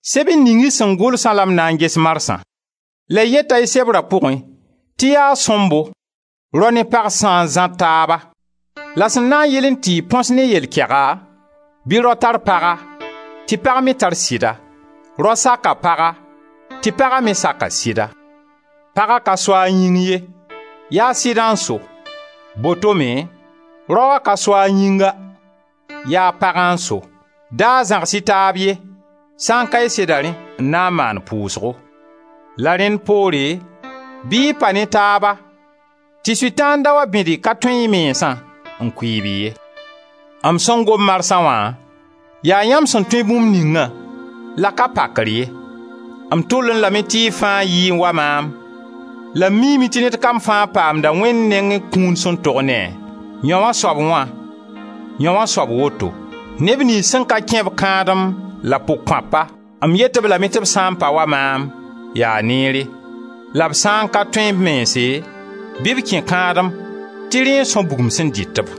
Sebr ning y sẽn gʋlsã la m na n ges marsã. La y yeta y sebra pʋgẽ tɩ yaa sõmbo rao ne pag sã n zãr taaba. La sẽn na n yɩlẽ tɩ y põs ne yɛl kɛga, bɩ rao tar paga, tɩ pag me tar sɩda. Rao sak a paga tɩ paga me sak a sɩda. Paga ka so a yĩng ye, yaa sɩdã n so. Botome raoa ka so a yĩnga, yaa pagã n so. Da zãgs-y taab ye, sã n ka y seda rẽ, n na n maan pʋʋsgo. La rẽnd poore, bɩ y pa ne taaba tɩ Sʋtãan da wa bẽd y ka tõe y mensã, n kʋɩɩb-y ye. M sẽn gom marsa wã yaa yãmb sẽn tõe bũmb ningã, la ka pakr ye. M tʋllẽ lame tɩ y fãa yɩẽ wa maam; la m miime tɩ ned kam fãa paamda Wẽnd nengẽ kũun sẽn tog ne-a: yãoo soab wã, yãoo soab woto. Neb niyns sẽn ka kẽ-b kãadem la pʋg-kõapa, m yet-b lame tɩ b sã n pa wa maam, yaa neere. La b sã n ka tõe b mense, bɩ b kẽ kãadem tɩ rẽ n são bugum sẽn dɩt-b.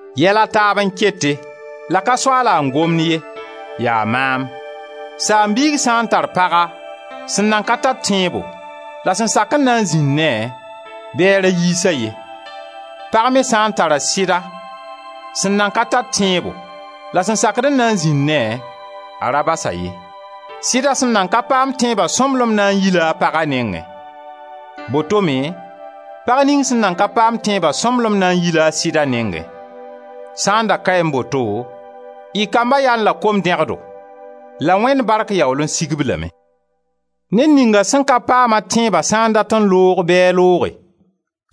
Yɛla taab n kete, la ka Soaala n gomd ye, yaa maam: saam-biig sã n tar paga sẽn nan ka tar tẽebo la sẽn sak n na n zĩnd ne-a, bɩ a ra yiis-a ye. Pag me sã n tara sɩda sẽn nan ka tar tẽebo la sẽn sakd n na n zĩnd ne-a, a ra bas-a ye. Sɩda sẽn nan ka paam tẽebã sõmblem na n yi-la a paga nengẽ. Botome pag ning sẽn nan ka paam-a tẽebã sõmblem na n yi-la a sɩda nengẽ. Sã n da kaẽ boto, y kamba yaẽ la kom-dẽgdo la Wẽnd bark yaool n sig-b lame. Ned ninga sẽn ka paam-a tẽebã sã n dat n loog bɩ a looge: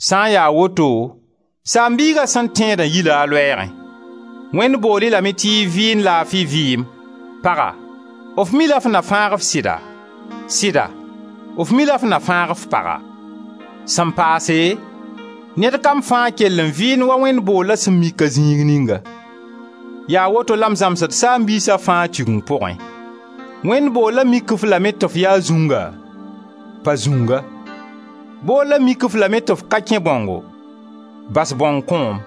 sã n ya woto saam-biiga sẽn tẽedã yi-la a loɛɛgẽ. Wẽnd bool-y lame tɩ y vɩɩnd laafi vɩɩm. Paga, f mi-la f na fãag f sɩda? Sɩda, f mi-la f na fãag f paga? Sẽn paase, yaa ned kam fãa kell n vɩɩnd wa Wẽnd boolla sẽn mik-a zĩig ninga. Yaa woto la m zãmsd saam-biisa fãa Tigeng pʋgẽ. Wẽnd boolla mik-f lame tɩ f ya zũnga, pa zũnga; boolla mik-f lame tɩ f ka kẽ bãongo, bas bãong kõom.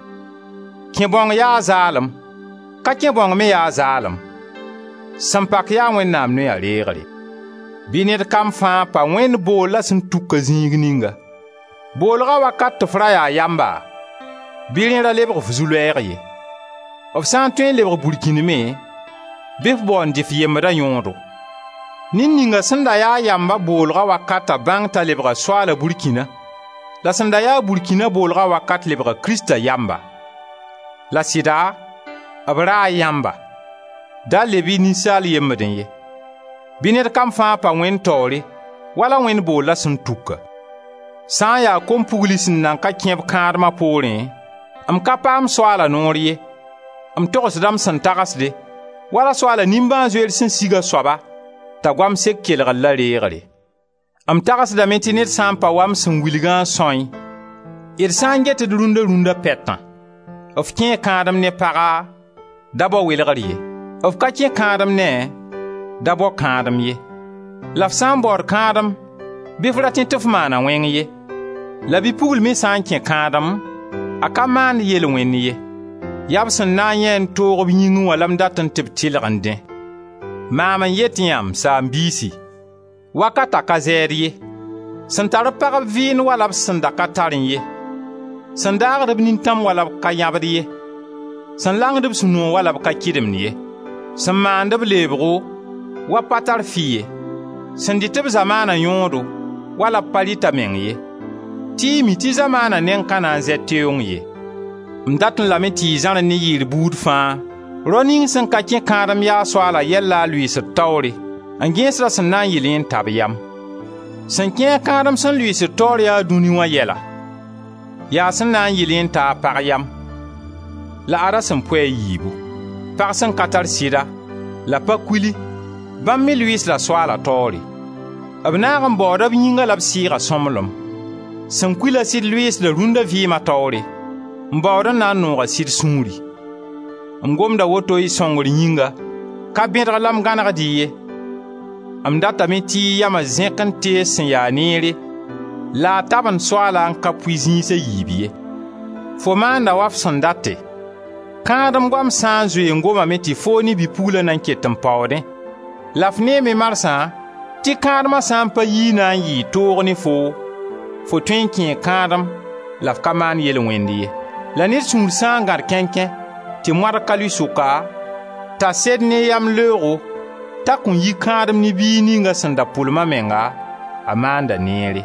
Kẽe bãong yaa zaalem, ka kẽ bãong me yaa zaalem; sẽn pak yaa Wẽnnaam noya reegre. Bɩ ned kam fãa pa Wẽnd boolla sẽn tuk-a zĩig ninga. Boolga wakat tɩ f ra yaa yamba, bɩ rẽ ra lebg f zu-loɛɛg ye. F sã n tõe n lebg burkĩnd me bɩ f bao n dɩ f yembda yõodo. Ned ninga sẽn da yaa yamb a boolg wakata bãng t'a lebga Soaala burkĩna La sẽn da yaa burkĩna a boolga wakat lebga Krista yamba. La sɩda, b raa yãmba! Da leb-y ninsaalb yembdẽ ye. Bɩ ned kam fãa pa Wẽnd taoore wala Wẽnd boolla sẽn tuk-a. Sã n ya kom-pugli sẽn nan ka kẽb kãadma poorẽ, m ka paam Soaala noor ye, m togsda m sẽn tagsde, wala Soaala nimbãan-zoeer sẽn sig a soaba t'a goam sek kelgre la reegre. M tagsdame tɩ ned sã n pa wa m sẽn wilgã n sãoẽ, d sã n get d rũnna-rũnna pɛtã. F kẽe kãadem ne paga, da bao welgr ye. F ka kẽ kãadem ne-a, ra bao kãadem ye. La f sã n baood kãadem bɩ f ra tẽ tɩ f maana wẽng ye. La bi-pugl me sã n kẽ kãadem, a ka maand yel-wẽnd ye. Ya b sẽn na n yãe toog b yĩngẽ wã la m datẽ tɩ b tɩlgẽ dẽ. Maam n yet yã, m saam-biisi: wakata ka zɛɛd ye. Sẽn tar-b pagb vɩɩnd wala b sã n da ka tarẽ ye. Sẽn daagd-b nintãm wala b ka yãbd ye; sẽn langd-b sũ-noogo wala b ka kɩdemd ye; sẽn maand-b leebgo wa b pa tar fɩ ye; sẽn dɩt-b zamaana yõodo wala b pa rɩt-a meng ye, tɩ y mi tɩ zamaana neng ka na n zɛ teoong ye. M datẽ lame tɩ y zãrẽ ne yɩɩr buud fãa. Rao ning sẽn ka kẽ kãadem yaa Soaala yɛl la a lʋɩɩsd taoore, n gẽesd a sẽn na n yɩlẽ n ta b yam. Sẽn kẽ-a kãadem sẽn lʋɩɩsd taoore yaa dũni wã yɛla, yaa a sẽn na n yɩlẽ n ta a pag yam, la ad-a sẽn pʋɩ a yiibu. Pag sẽn ka tar sɩda, la pa-kuli, bãmb me lʋɩɩsda Soaala taoore; b naag n baooda b yĩnga la b sɩɩga sõmblem. Sẽn kul-a sɩd lʋɩɩsda rũnda vɩɩma taoore, n baood n na n noog a sɩd sũuri. M gomda woto y sõngr yĩnga, ka bẽdg la m gãnegd-y ye, m datame tɩ y yama zẽk n tees sẽn ya neere la a tabend Soaala n ka pʋɩ zĩis a yiib ye. Fo maanda wa f sẽn date, kãadem goam sãn zoe n gomame tɩ foo ne bi-pugla nan ket n paoodẽ la f neeme marsã tɩ kãadma sã pa yi na yɩɩ toog ne foo, Fo tõe n kẽe kãadem la f ka maand yel-wẽnd ye. La ned sũur sã n gãd kẽnkẽ, tɩ moadg ka lʋɩ sʋka, t'a sed ne yamleoogo t'a kõn yi kãadem ne biig ning a sẽn da pʋlem a menga, a maanda neere.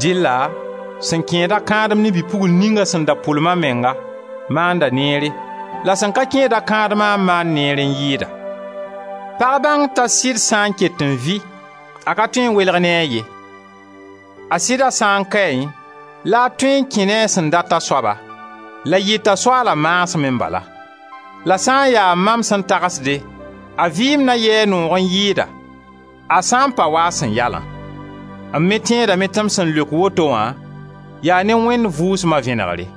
Dɩlla sẽn kẽeda kãadem ne bi-pugl ning a sẽn da pʋlem a menga, maanda neere, la sẽn ka kẽeda kãadma n maand neer n yɩɩda. Pag bãng t'a sɩd sã n ket n vɩ a ka tõe n welg ne a ye. A sɩda sã n kaẽ la a tõe n kẽ ne a sẽn dat a soaba, la yɩta Soaala maasmẽ bala. La sã n ya mam sẽn tagsde, a vɩɩm na yɩ-a noog n yɩɩda, a sã n pa wa a sẽn ya-lã. M me tẽedame tɩ m sẽn leok woto wã yaa ne Wẽnd Vʋʋsma vẽnegre.